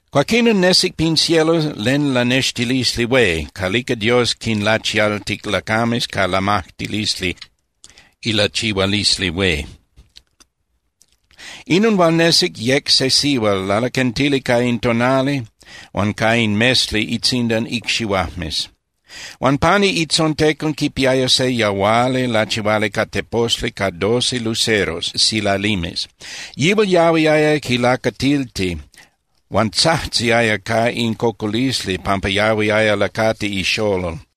Cuaquinon nesic pin cielo len lanextilisli hué calica Dios quinlachialtic lacames ca lamajtilisli ilachihualisli hué. Inon hual nesic yec se sihual lalaquentili ca in tonali huan ca in mesli itzindan icxihuajmes. Huan pani itzontecon quipiaya se yahuali lachihuali ca teposli ca doce luceros (silalimes). Yihual yahuiaya quilacatilti huan tzajtziaya ca in cocolisli pampa yahuiaya lacati ixolol.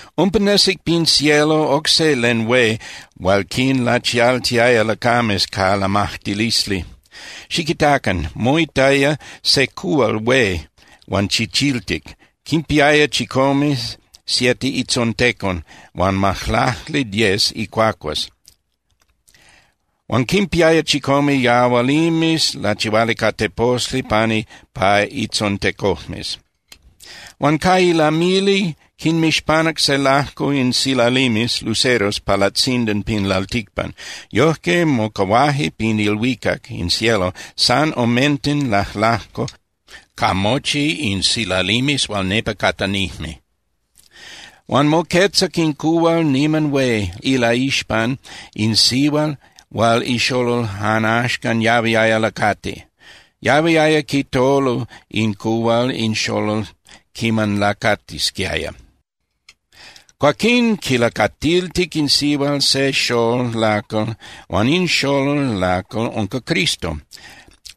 Umpa nesic pin cielo oc se len hué hual quinlachialtiaya lacames ca lamajtilisli. Xiquitacan, moitaya se cuhual hué huan chichiltic, quinpiaya chicome (siete) itzontecon huan majlacli (diez) icuacuas huan quinpiaya chicome yahualimes lachihuali ca teposli pani pa itzontecojmes. Huan ca ilamili quinmixpanac se lajco in silalimes (luceros) pa latzindan pin lalticpan. Yojque mocahuaje pin ilhuicac (in cielo) san omenten lajlajco ca mochi in silalimes hual nepa catanijme. Huan moquetzac in cuhual niman hué ilaixpan in sihual hual ixolol jan axcan yahuiaya lacati. Yahuiaya quitolu in cuhual in xolol quiman lacatisquiaya. Cuaquín quilacatiltic in sihual se xolol lacal huan in xolol lacal unca Cristo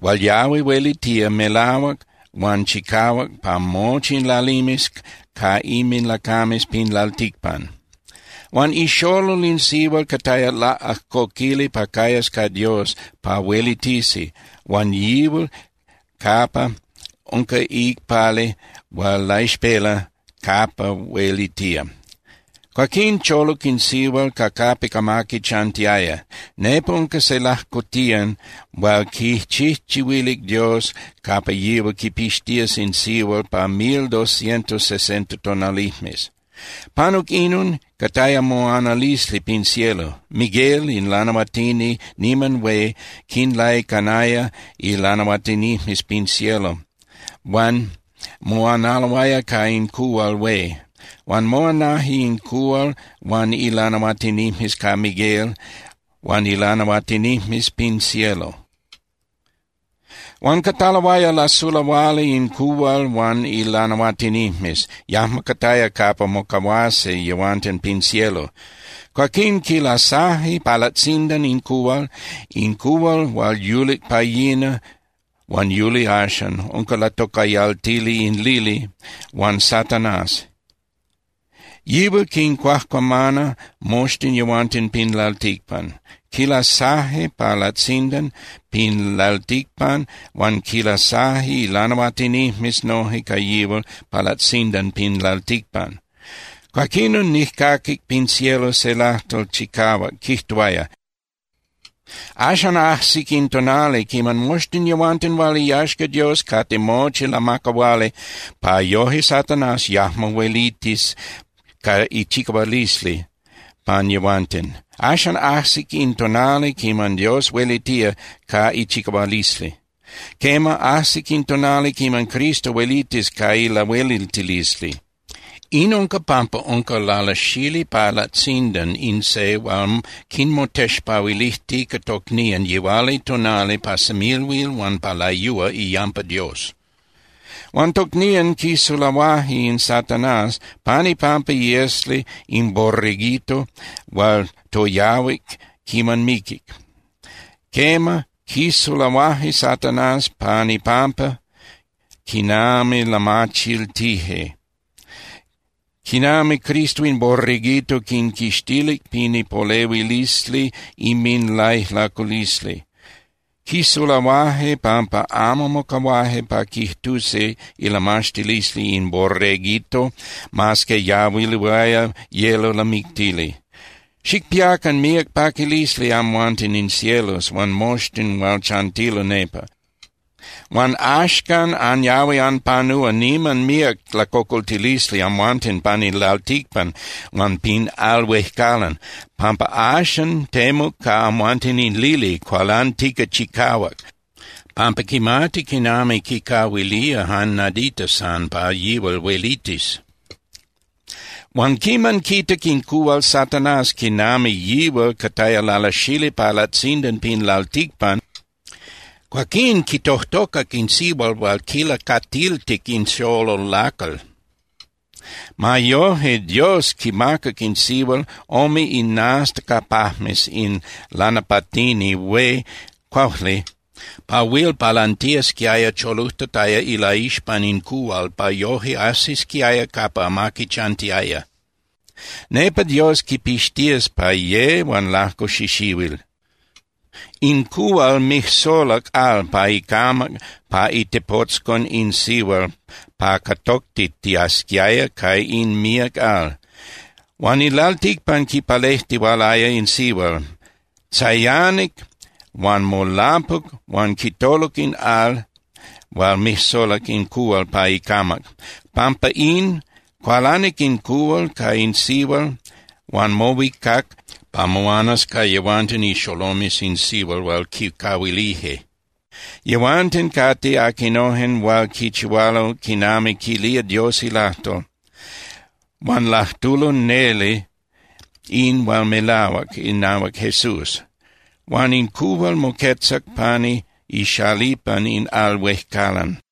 hual yahui huelitía melahuac huan chicahuac pa mochi in lalimes ca inminlacames pin lalticpan. Huan ixolol in sihual cataya laꞌajcoquili pa cayas ca Dios pa huelitisi huan yihual capa unca iicpali hual laixpela capa huelitía. Cuaquín choluc in sihual ca capic amaqui chantiaya. Nepa unca se lajcotiyan hual quichijchihuilic Dios capa yihual quipixtías in sihual pa mil doscientos sesenta tonalijmes. Panuc inon, cataya moanalisli pin cielo. Miguel in lanahuatini niman hué quinlaicanaya ilanahuatinijmes pin cielo huan moanaloaya ca in cuhual hué. Huan moanaje in cuhual huan ilanahuatinijmes ca Miguel huan ilanahuatinijmes pin cielo. Huan cataloaya lasulahuali in cuhual huan ilanahuatinijmes, yajmo cataya capa mocahuasi yehuanten pin cielo. Cuaquín quilasaje pa latzindan in cuhual, in cuhual hual yulic pa yina huan yuli axan, unca latocayaltili in lili huan Satanás. Yihual quincuajcuamana moxtin yehuanten pin lalticpan. Quilasaje pa latzindan pin lalticpan huan quinlasaje ilanahuatinijmes noje ca yihual pa latzindan pin lalticpan. Cuaquinon nijcaquic pin cielo se lajtol chicahuac quijtuaya: —Axan ajsic in tonali quiman moxtin yehuanten hual iyaxca Dios cate mochi lamacahuali pa yoje Satanás yajmo huelitis ca ichicahualisli pan yehuanten. Axan ajsic in tonali quiman Dios huelitía ca ichicahualisli. Quema, ajsic in tonali quiman Cristo huelitis ca ilahueliltilisli. In unca pampa unca lalasali pa latzindan in se hual quinmotexpahuilijtica tocnían yihualitonali pa semilhuil huan pa layúa iyampa Dios. Huan tocnían quisulahuaje in Satanás pan ipampa iesli in Borreguito hual toyahuic quiman miquic. Quema, quisulahuaje Satanás pan ipampa quinami lamachiltije quinami Cristo in Borreguito quinquixtilic pin ipolehuilisli inminlaijlaculisli. Quisulahuaje pampa amo mocahuaje pa quijtusi ilamaxtilisli in Borreguito, mas que yahuiloaya yelo lamictili. ¡Xicpiacan míac paquilisli amhuanten in cielos huan moxtin hual chantilo nepa! Huan ¡axcan anyahui anpanúa niman míac lacocoltilisli amhuanten pan in lalticpan huan pin al huejcalan, pampa axan temuc ca amhuanten in lili cualantica chicahuac pampa quimati quinami quicahuilía jan nadita san pa yihual huelitis! Huan quiman quitac in cuhual Satanás quinami yihual cataya lalasali pa latzindan pin lalticpan, cuaquín quitojtocac in sihual hual quilacatiltic in xolol lacal. Ma yoje, Dios quimacac in sihual ome inastacapajmes in lanapatini hué (cuaujli) pa huil palantiasquiaya cholujtataya ilaixpan in cuhual pa yoje ajsisquiaya capa amaqui chantiaya. Nepa Dios quipixtías pa ye huan lajco xixihuil. In cuhual mijsolac al pa icamac pa itepotzcon in sihual pa catoctitiasquiaya ca in míac al. Huan in lalticpan quipalejtihualaya in sihual, tzayanic huan molapuc huan quitoluc in al hual mijsolac in cuhual pa icamac. Pampa in, cualanic in cuhual ca in sihual huan mohuicac pa moanas ca yehuanten ixolomes in sihual hual quicahuilije. Yehuanten cate aquinojen hual quichihualo quinami quilía Dios ilajtol, huan lajtulo neli in hual melahuac inahuac Jesús. Huan in cuhual moquetzac pani ixalipan in al huejcalan.